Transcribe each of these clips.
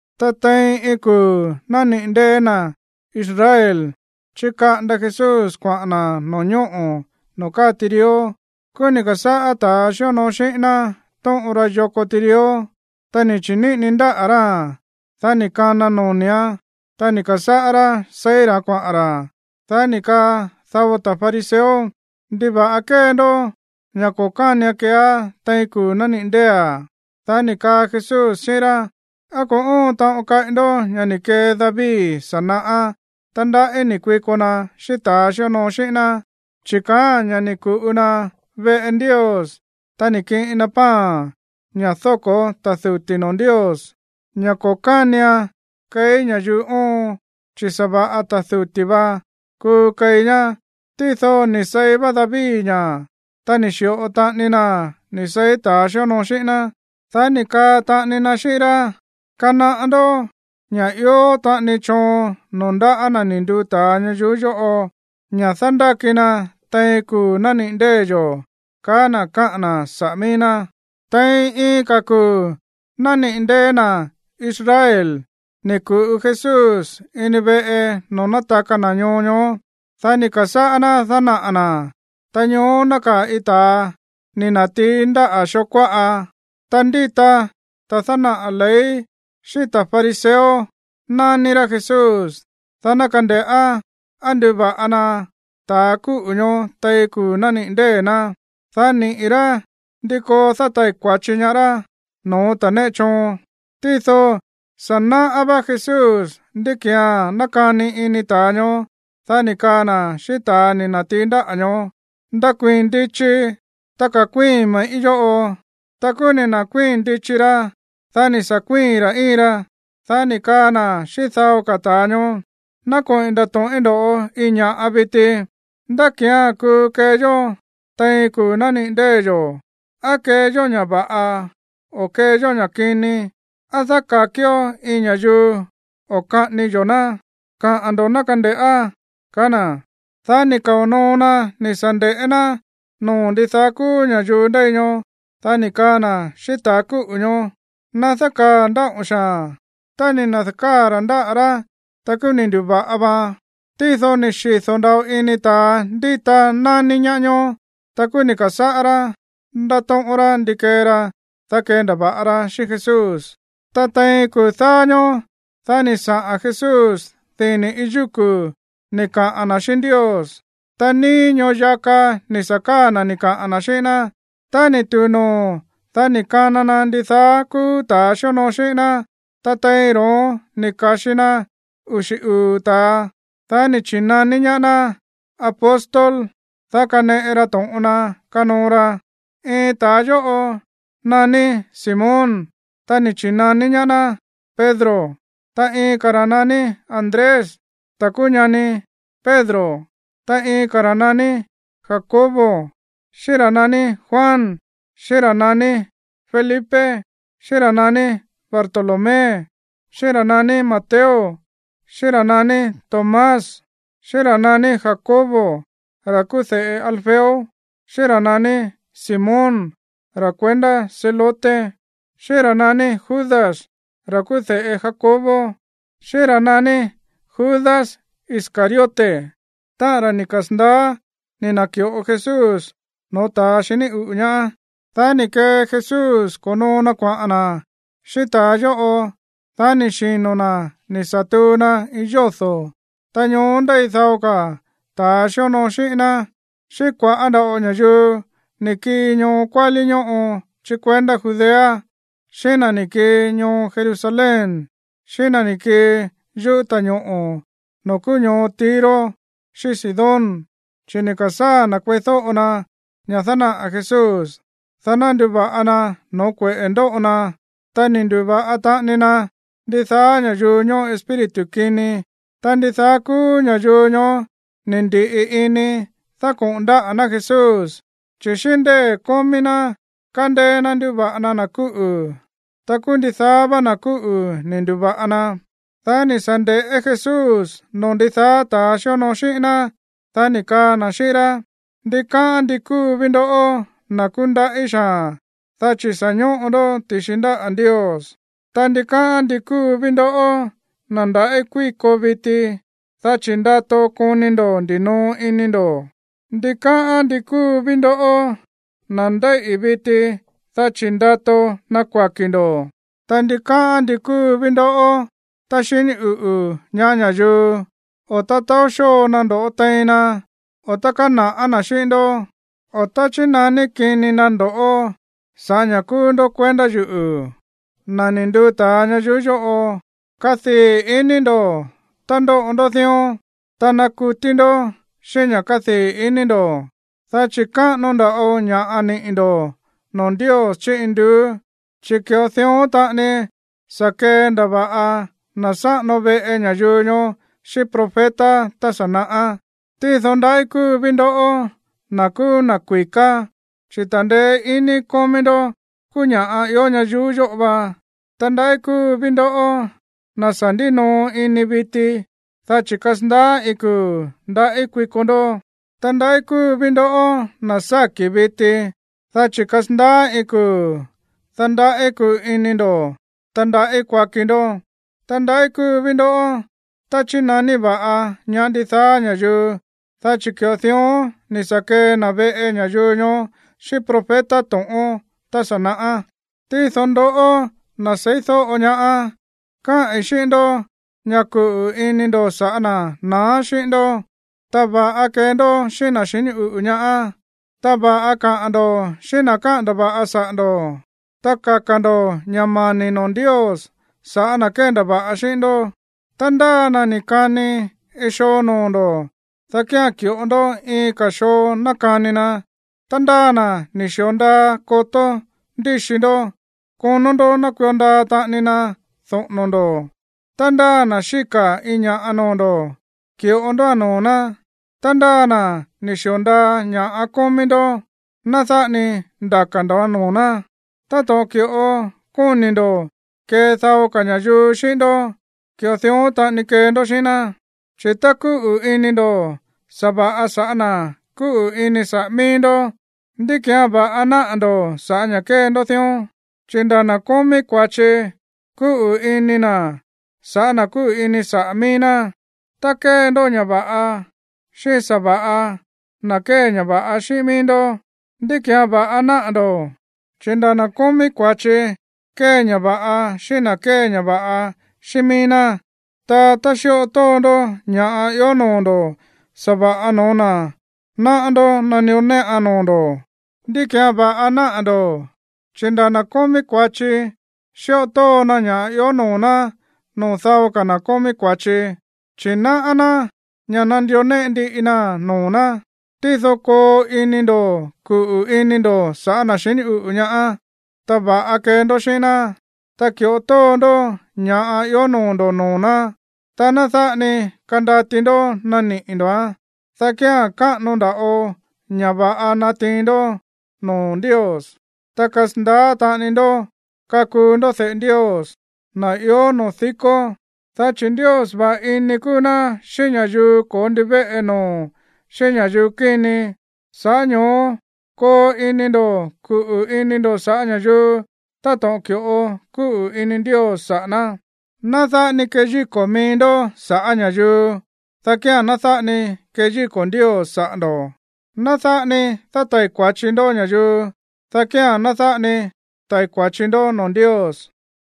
Ta tein iin kuu̱ nániꞌi̱ ndée̱ na̱ Israel, chíkaꞌanda Jesús kuaꞌa̱n na̱ no̱ñóꞌo̱ noo̱ káa tirió. Kúú ni̱ ka̱sáꞌá ta̱ xíonoo xíꞌín ná tóꞌon ra yoko tirió. Ta ni̱ chi̱níꞌini ndáꞌa̱ ráa̱n, dá ni̱ kana noni̱án, ta ni̱ ka̱sáꞌá rá seí ra̱án kuaꞌa̱n ra̱. Dá ni̱ kaa dao ta̱ fariseo: ―¿Ndiva̱ꞌa kée ndó ña̱ ko̱ kánian keeá tein kuu̱ nániꞌi̱ ndée̱a̱? Dá ni̱ kaa Jesús xíꞌín rá: ―¿Á ko̱ óon taꞌon kaꞌi ndoꞌó ña̱ ni̱ kee David sa̱ naꞌá tá ndaꞌí ni̱ kuiko na xíꞌín ta̱a xíonoo xíꞌín ná? Chi̱ kaáa̱n ña̱ ni̱ ku̱ꞌu na veꞌe Ndios, ta ni̱ kiꞌin na pan, ña̱ dóko̱ ta̱ duti̱ noo̱ Ndios, ña̱ ko̱ kánian keí ña̱yuu oon, chi̱ sa̱va̱ꞌa ta̱ duti̱ vá kuu keí ñá. Tído ni̱ seí va David ña̱, ta ni̱ xi̱ꞌo taꞌani naa̱n ni̱ seí ta̱a xíonoo xíꞌín ná. Dá ni̱ kaa taꞌani na xíꞌín rá: ―Kanaꞌá ndó ña̱ ió taꞌani choon noo̱ ndáꞌa̱ na̱ ni̱ nduu ta̱a ñayuú yóꞌo ña̱ dándáki na tein kuu̱ nániꞌi̱ ndée̱ yo̱ ―kaá na̱ káꞌa̱n na̱ saꞌa̱ mií ná. Tein iin ka̱ kuu̱ nániꞌi̱ ndée̱ na̱ Israel ni̱ ku̱ꞌu Jesús ini veꞌe noo̱ nátaka na̱ ñoo ñoó. Dá ni̱ ka̱sáꞌá ná dánaꞌa̱ na̱. Ta ñoó nákaa̱ iin ta̱a ni̱ na̱tií ndáꞌa̱ xoo kuáꞌa. Ta ndíta ta̱ dánaꞌa̱ ley xíꞌín ta̱ fariseo nání rá Jesús, dá ná kande̱ꞌá á nduva̱ꞌa na ta̱ kúꞌu̱ ñoó tein kuu̱ nániꞌi̱ ndée̱ ná, dá niꞌi̱ rá ndí koo dátai̱ kua̱chi ñaá rá no̱ó ta̱ néꞌe choon. Tído sa̱ náꞌá vá Jesús ndí ki̱án nákani ini ta̱a ñoó. Dá ni̱ kaa na̱ xíꞌín ta̱ ni̱ na̱tií ndáꞌa̱ ñoó: ―Ndakuii̱n ndichi, ta ka̱kuíi̱n me̱ꞌí yóꞌo. Ta kúú ni̱ na̱kuii̱n ndichi ra, dá ni̱ sa̱ kuíi̱n ra̱ íin ra. Dá ni̱ kaa Jesús xíꞌín dao ka̱ ta̱a ñoó: ―Ná koꞌi̱n ndato̱ꞌín ndo̱ꞌó iin ña̱ꞌa viti. ¿Ndá ki̱án kuu kee yó tein kuu̱ nániꞌi̱ ndée̱ yo̱? ¿Á kee yó ña̱ va̱ꞌa o á kee yó ña̱ kini? ¿Á dáka̱kió iin ña̱yuu o kaꞌání yo̱ ná? Kaꞌa̱n ndo̱ ná kande̱ꞌá ―kaá na̱. Dá ni̱ kao̱ noo na ni̱ sa̱ nde̱ꞌé ná noo̱ ndidaá kúú ña̱yuu ndéi ñoó. Dá ni̱ kaa na̱ xíꞌín ta̱a kúꞌu̱ ñoó: ―Ná dákaa̱ ndáꞌo̱n xaa̱n. Tá ni̱ na̱da̱káa̱ ra̱ ndáꞌa̱ rá, ta kúú ni̱ ndu̱va̱ꞌa vaan. Tído ni̱ xido̱ nda̱ꞌo ini ta̱a ndíta nání ñaá ñoó. Ta kúú ni̱ ka̱sáꞌá rá ndátóꞌón rá ndí kee ra, dá kendava̱ꞌa ra xíꞌín Jesús. Ta tein kuu̱ dáá ñóó, dá ni̱ saꞌa̱n Jesús dini̱ iin yúku̱ ni̱ kaꞌa̱n na̱ xíꞌín Ndios. Ta níí ñoo yaka ni̱ sa̱ káa̱ na̱ ni̱ kaꞌa̱n na̱ xíꞌín ná. Tá ni̱ tu̱u noo̱, dá ni̱ kana na ndidaá kúú ta̱a xíonoo xíꞌín ná. Ta tein ro̱ón ni̱ ka̱xi na uxi̱ uu̱ ta̱a, dá ni̱ chi̱naní ñaá ná apóstol, dá kaneꞌe ra to̱ꞌon na kanoo ra. Iin ta̱a yóꞌo naní Simón. Ta ni̱ chi̱naní ñaá ná Pedro, ta iin ka̱ ra̱ naní Andrés, ta̱ kúú ñani Pedro. Ta iin ka̱ ra̱ naní Jacobo, xíꞌín ra̱ naní Juan, xíꞌín ra̱ naní Felipe, xíꞌín ra̱ naní Bartolomé, xíꞌín ra̱ naní Mateo, xíꞌín ra̱ naní Tomás, xíꞌín ra̱ naní Jacobo, ra̱ kúú de̱ꞌe Alfeo, xíꞌín ra̱ naní Simón, ra̱ kuendá Zelote, xíꞌín ra̱ naní Judas, ra̱ kúú de̱ꞌe Jacobo, xíꞌín ra̱ naní Judas Iscariote, táꞌa̱n ra̱ ni̱ kasa̱ndaá ni̱ na̱ki̱ꞌo Jesús no̱ó ta̱ xiní uꞌu̱ ñaá. Dá ni̱ kee Jesús ko̱noo na kuaꞌa̱n na̱ xíꞌín ta̱a yóꞌo. Dá ni̱ xino̱ na̱ ni̱ sa̱ tuu na iin yódo̱. Ta ñoó ndéi dao ka̱ ta̱ xíonoo xíꞌín ná, xíꞌín kua̱ꞌá nda̱ꞌo ña̱yuu ni̱ kii ñoo kuálí ñóꞌo chí kuendá Judea, xíꞌín na̱ ni̱ kii ñoo Jerusalén, xíꞌín na̱ ni̱ kii yuꞌú ta̱ñoꞌo̱ noo̱ kúú ñoo Tiro xíꞌín Sidón, chi̱ ni̱ ka̱sáa̱ na̱ kueídóꞌo na ña̱ dánaꞌa̱ Jesús, dá ná nduva̱ꞌa na no̱ó kueꞌe̱ ndóꞌo na. Ta ni̱ ndu̱va̱ꞌa taꞌani na ndidaá ña̱yuu ñóꞌo espíritu kini. Ta ndidaá kúú ña̱yuu ñoó ni̱ ndi̱ꞌi ini dákoꞌo̱n ndáꞌa̱ ná Jesús, chi̱ xíꞌín ndée̱ kómí ná, kándéé ná nduva̱ꞌa na na̱ kúꞌu̱. Ta kúú ndidaá vá na̱ kúꞌu̱ ni̱ ndu̱va̱ꞌa na. Dá ni̱ sa̱ nde̱ꞌé Jesús noo̱ ndidaá ta̱a xíonoo xíꞌín ná, dá ni̱ kaa na̱ xíꞌín rá: ―Ndikáꞌán ndi kúu ví ndoꞌó, na̱ kúndaꞌí xaa̱n, dá chi̱ sa̱ ñóꞌo ndó ti̱xi ndáꞌa̱ Ndios. ’Ta ndikáꞌán ndi kúu ví ndoꞌó, na̱ ndaꞌí kuíko viti, dá chi̱ ndato koni ndo̱ ndinoo ini ndo̱. ’Ta ndikáꞌán ndi kúu ví ndoꞌó, na̱ ndéíꞌi̱ viti, dá chi̱ ndato ná kuaki̱ ndo̱. ’Ta ndikáꞌán ndi kúu ví ndoꞌó tá xiní uꞌu̱ ñaá ña̱yuu, o tá taó xóo na ndo̱ꞌó tein na, o tá kána̱ꞌá na̱ xíꞌín ndó, o tá chínaní kini na ndo̱ sa̱ꞌá ña̱ kúú ndó kuendá yuꞌu̱, na̱ ni̱ nduu ta̱a ñayuú yóꞌo. Kadii̱ iní ndo̱ tá ndóꞌo ndó dión, ta nakutí ndó xíꞌín ña̱ kádii̱ iní ndo̱, dá chi̱ káꞌano nda̱ꞌo ña̱ꞌa niꞌi̱ ndo̱ noo̱ Ndios chí induú, chi̱ ki̱ꞌo dión taꞌani sa̱ kendava̱ꞌa na̱ sáꞌano veꞌe ña̱yuu ñoó xíꞌín profeta tá sa̱ naꞌá. ’Tído ndaꞌí kúu ví ndoꞌó, na̱ kúú na̱ kui̱ká, chi̱ ta̱ndeé iní kómí ndó kúú ña̱ ió ñayuú yóꞌo va. ’Ta ndaꞌí kúu ví ndoꞌó, na̱ sa̱ ndínoo ini viti, dá chi̱ kasandaá iin kuu̱ ndaꞌí kuiko ndó. ’Ta ndaꞌí kúu ví ndoꞌó, na̱ sáki̱ viti, dá chi̱ kasandaá iin kuu̱, dá ndaꞌí kuu ini ndo̱, ta ndaꞌí kuaki ndó. ’Ta ndaꞌí kúu ví ndoꞌó tá chínaní va̱ꞌa ñaá ndidaá ña̱yuu, dá chi̱ ki̱ꞌo dión ni̱ sa̱ kee na̱ veꞌe ña̱yuu ñoó xíꞌín profeta to̱ꞌón tá sa̱ naꞌá. ’Tído ndoꞌó, na̱ seídóꞌo ñaá, káꞌi̱n xíꞌín ndó ña̱ kuꞌu̱ ini ndo̱ sa̱ꞌá na̱ naá xíꞌín ndó, ta va̱ꞌa kee ndó xíꞌín na̱ xiní uꞌu̱ ñaá. Ta va̱ꞌa kaꞌa̱n ndo̱ xíꞌín na̱ káꞌa̱n ndava̱ꞌa saꞌa̱ ndo̱. Ta kaka̱ ndo̱ ña̱ mani̱ noo̱ Ndios sa̱ꞌá na̱ kéndava̱ꞌa xíꞌín ndó. Ta ndáa na̱ ni̱ kani iin xoo noo̱ ndo̱, dá kía̱n ki̱ꞌo ndó iin ka̱ xoo ná kani na. Ta ndáa na̱ ni̱ xi̱o ndaa kotó ndíxi ndó, konó ndó ná kuio ndaa taꞌani na doꞌo̱no̱ ndo̱. Tá ndáa na̱ xíka̱ iin ña̱ꞌa noo̱ ndo̱, ki̱ꞌo ndóa̱n noo̱ ná. Ta ndáa na̱ ni̱ xi̱o ndaa ña̱ꞌa kómí ndó, ná dáꞌa ni ndaka̱ ndo̱án noo̱ ná. Táto̱ꞌon ki̱ꞌo kóni̱ ndo̱ kee dao ka̱ ña̱yuu xíꞌín ndó, ki̱ꞌo dión taꞌani kee ndó xíꞌín ná. ’Chi̱ tá kúꞌu̱ ini ndo̱ sa̱va̱ꞌa sa̱ꞌá na̱ kúꞌu̱ ini saꞌa̱ mií ndó, ¿ndí ki̱án va̱ꞌa náꞌa̱ ndo̱ sa̱ꞌá ña̱ kée ndó dión? Chi̱ nda̱ na̱ kómí kua̱chi kúꞌu̱ ini na̱ sa̱ꞌá na̱ kúꞌu̱ ini saꞌa̱ mií ná. Tá kée ndó ña̱ va̱ꞌa xíꞌín sa̱va̱ꞌa na̱ kée ña̱ va̱ꞌa xíꞌín mií ndó, ¿ndí ki̱án va̱ꞌa náꞌa̱ ndo̱? Chi̱ nda̱ na̱ kómí kua̱chi kée ña̱ va̱ꞌa xíꞌín na̱ kée ña̱ va̱ꞌa xíꞌín mií ná. Ta tá xíꞌo tóo ndó ña̱ ió noo̱ ndo̱ sa̱va̱ꞌa no̱ó na̱ náꞌá ndó nandió néꞌan noo̱ ndo̱, ¿ndí ki̱án va̱ꞌa náꞌa̱ ndo̱? Chi̱ nda̱ na̱ kómí kua̱chi xíꞌo tóo na ña̱ ió noo̱ ná noo̱ dao ka̱ na̱ kómí kua̱chi, chi̱ náꞌá ná ña̱ nandió néꞌe ndiꞌi naa̱n noo̱ ná. Tído koo ini ndo̱ kuꞌu̱ ini ndo̱ sa̱ꞌá na̱ xiní uꞌu̱ ñaá, ta va̱ꞌa kee ndó xíꞌín ná, ta ki̱ꞌo tóo ndó ña̱ ió noo̱ ndo̱ noo̱ ná, ta ná dáꞌa ni kandati ndó naniꞌi̱ ndo̱án, dá kía̱n káꞌano nda̱ꞌo ña̱ va̱ꞌa natiin ndó noo̱ Ndios, ta kasandaá taꞌani ndó kakuu ndó de̱ꞌe Ndios, na̱ ió noo̱ dikó. Dá chi̱ Ndios va̱ꞌa ini kúú ná xíꞌín ña̱yuu ko̱ó ndivéꞌe noo̱, xíꞌín ña̱yuu kíni. Sa̱ꞌá ño̱ó koo ini ndo̱ kuꞌu̱ ini ndo̱ sa̱ꞌá ña̱yuu táto̱ꞌon ki̱ꞌo kúꞌu̱ ini Ndios saꞌa̱ ná. ’Ná dáꞌa ni keyíko̱ mií ndó sa̱ꞌá ña̱yuu, dá kía̱n ná dáꞌa ni keyíko̱ Ndios saꞌa̱ ndo̱. Ná dáꞌa ni dátai̱ kua̱chi ndó ña̱yuu, dá kía̱n ná dáꞌa ni tai̱ kua̱chi ndó noo̱ Ndios.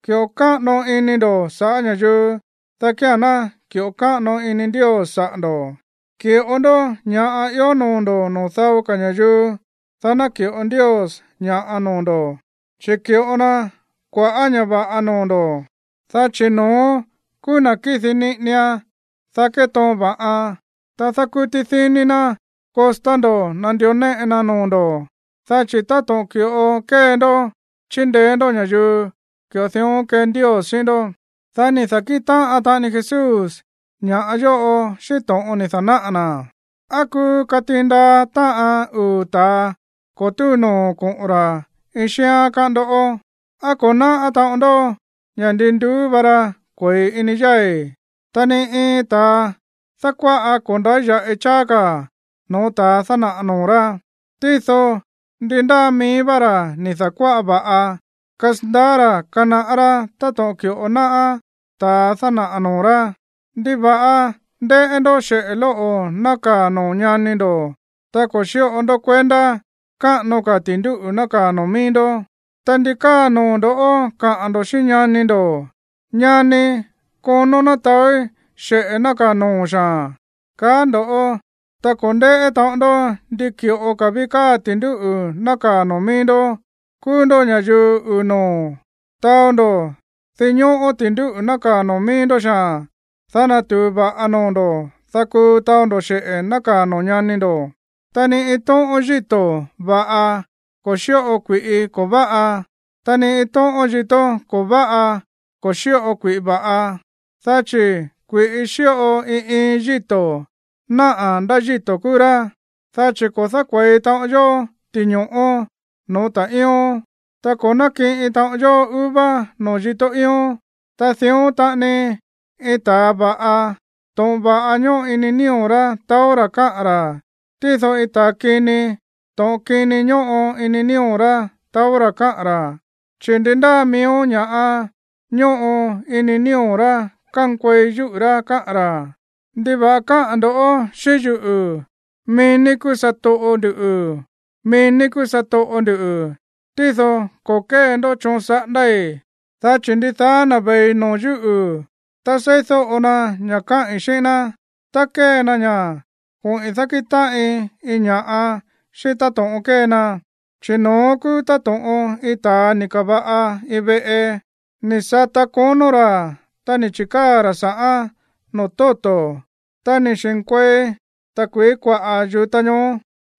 Ki̱ꞌo káꞌano ini ndo̱ sa̱ꞌá ña̱yuu, dá kía̱n ná ki̱ꞌo káꞌano ini Ndios saꞌa̱ ndo̱. Ki̱ꞌo ndó ña̱ ió noo̱ ndo̱ noo̱ dao ka̱ ña̱yuu, dá naki̱ꞌo Ndios ña̱ꞌa noo̱ ndo̱, chi̱ ki̱ꞌo na kua̱ꞌá ña̱ va̱ꞌa noo̱ ndo̱, dá chi̱ no̱ón kúú na̱ kidi niꞌinian, dá ketoon va̱ꞌan, ta dákútí díní ná kostá ndo̱ nandió néꞌe naa̱n noo̱ ndo̱, dá chi̱ táto̱ꞌon ki̱ꞌo kée ndó chindeé ndó ña̱yuu, ki̱ꞌo dión kee Ndios xíꞌín ndó. Dá ni̱ da̱kíꞌin táꞌan taꞌani Jesús ña̱ yóꞌo xíꞌín to̱ꞌon ni̱ da̱náꞌa̱ na̱: ―¿Á kuu katiin ndaa táꞌan uu̱ ta̱a ko̱ túu no̱ó koꞌo̱n ra̱ iin xíán, káꞌán ndó? ¿Á ko̱ náꞌá taꞌon ndó ña̱ ndin nduú va ra kue̱i ini yái̱? Ta ni iin ta̱a dákuáꞌa ko̱ ndáya̱ꞌi cháá ka̱ no̱ó ta̱a dánaꞌa̱ noo̱ rá. Tído ndi ndáa mií vá ra̱ ni̱ da̱kuáꞌa va̱ꞌa, kasandaá ra̱ kanaꞌá rá táto̱ꞌon ki̱ꞌo náꞌá ta̱a dánaꞌa̱ noo̱ rá. ¿Ndiva̱ꞌa ndéꞌé ndó xeꞌe̱ lóꞌo̱ nákaa̱ noo̱ ñani ndo̱, ta ko̱ xíꞌo ndó kuendá káꞌano ka̱ ti̱ndúꞌu̱ nákaa̱ noo̱ mií ndó? Ta, ¿ndi káa noo̱ ndo̱ kaꞌa̱n ndo̱ xíꞌín ñani ndo̱: “Ñanii̱, konón ná taói̱ xeꞌe̱ nákaa̱ noo̱o̱n xaa̱n”, kaá ndo̱, ta ko̱ ndéꞌé taꞌon ndó ndi ki̱ꞌo ví káa ti̱ndúꞌu̱ nákaa̱ noo̱ mií ndó? ¡Kúú ndó ña̱yuu uu̱ noo̱! Taó ndó dinñóꞌó ti̱ndúꞌu̱ nákaa̱ noo̱ mií ndó xaa̱n, dá natu̱u va̱ꞌa noo̱ ndo̱, dá kuu taó ndó xeꞌe̱ nákaa̱ noo̱ ñani ndo̱. ’Ta ni iin tóꞌón yíto̱ va̱ꞌa ko̱ xíꞌo kui̱ꞌi ko̱ váꞌa, ta ni iin tóꞌón yíto̱ ko̱ váꞌa ko̱ xíꞌo kui̱ꞌi va̱ꞌa. Dá chi̱ kui̱ꞌi xíꞌo iin iin yíto̱ náꞌa̱ ndá yíto̱ kúú rá, chi̱ ko̱ dákue̱i taꞌon yó ti̱ño̱ꞌó no̱ó ta̱ꞌíón, ta ko̱ nákiꞌin taꞌon yó uva noo̱ yíto̱ íón. Ta dión taꞌani iin ta̱a va̱ꞌa, to̱ꞌon va̱ꞌa ñóꞌo ini nío̱ rá taó rá káꞌa̱n ra̱. Tído iin ta̱a kini, to̱ꞌon kini ñóꞌo ini nío̱ rá taó rá káꞌa̱n ra̱. Chi̱ ndi ndáa miíó ña̱ꞌa ñóꞌo ini nío̱ rá kánkuei yúꞌu̱ rá káꞌa̱n ra̱. ’¿Ndiva̱ꞌa káꞌa̱n ndo̱ xíꞌín yuꞌu̱, mií ní kúú satoꞌo nduꞌu̱, mií ní kúú satoꞌo nduꞌu̱, tído ko̱ kée ndó choon saꞌándái̱? Dá chi̱ ndidaá na̱ ve̱i no̱ó yuꞌu̱, ta seídóꞌo na ña̱ kaꞌi̱n xíꞌín ná, ta kée na ña̱, koꞌi̱n dákíꞌin táꞌin iin ña̱ꞌa xíꞌín táto̱ꞌon kée na. Chi̱ no̱ón kúú táto̱ꞌon iin ta̱a ni̱ ka̱va̱ꞌa iin veꞌe. Ni̱ sata konó ra̱, ta ni̱ chi̱káa̱ ra̱ sa̱ꞌán noo̱ tóto̱. Ta ni̱ xi̱nkuei ta̱kui̱í kuaꞌa̱ yu̱ta ñoó,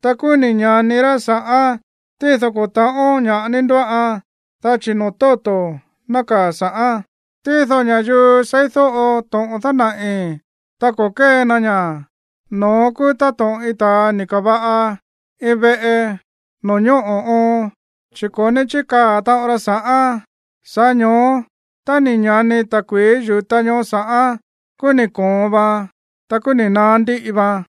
ta kúú ni̱ ña̱ni rá sa̱ꞌán, tído ko̱ ta̱ꞌón ña̱ꞌa ní ndóꞌan, dá chi̱ noo̱ tóto̱ nákaa̱ sa̱ꞌán. Tído ña̱yuu seídóꞌo to̱ꞌon dánaꞌi̱, ta ko̱ kée na ña̱, no̱ón kúú táto̱ꞌon iin ta̱a ni̱ ka̱va̱ꞌa iin veꞌe noo̱ ñóꞌo̱ oon, chi̱ ko̱ ní chíkaa̱ taꞌon ra sa̱ꞌán. Sa̱ꞌá ño̱ó tá ni̱ ña̱ni ta̱kui̱í yu̱ta ñoó sa̱ꞌán, kúú ni̱ koon vaan, ta kúú ni̱ naá ndíꞌi vaan.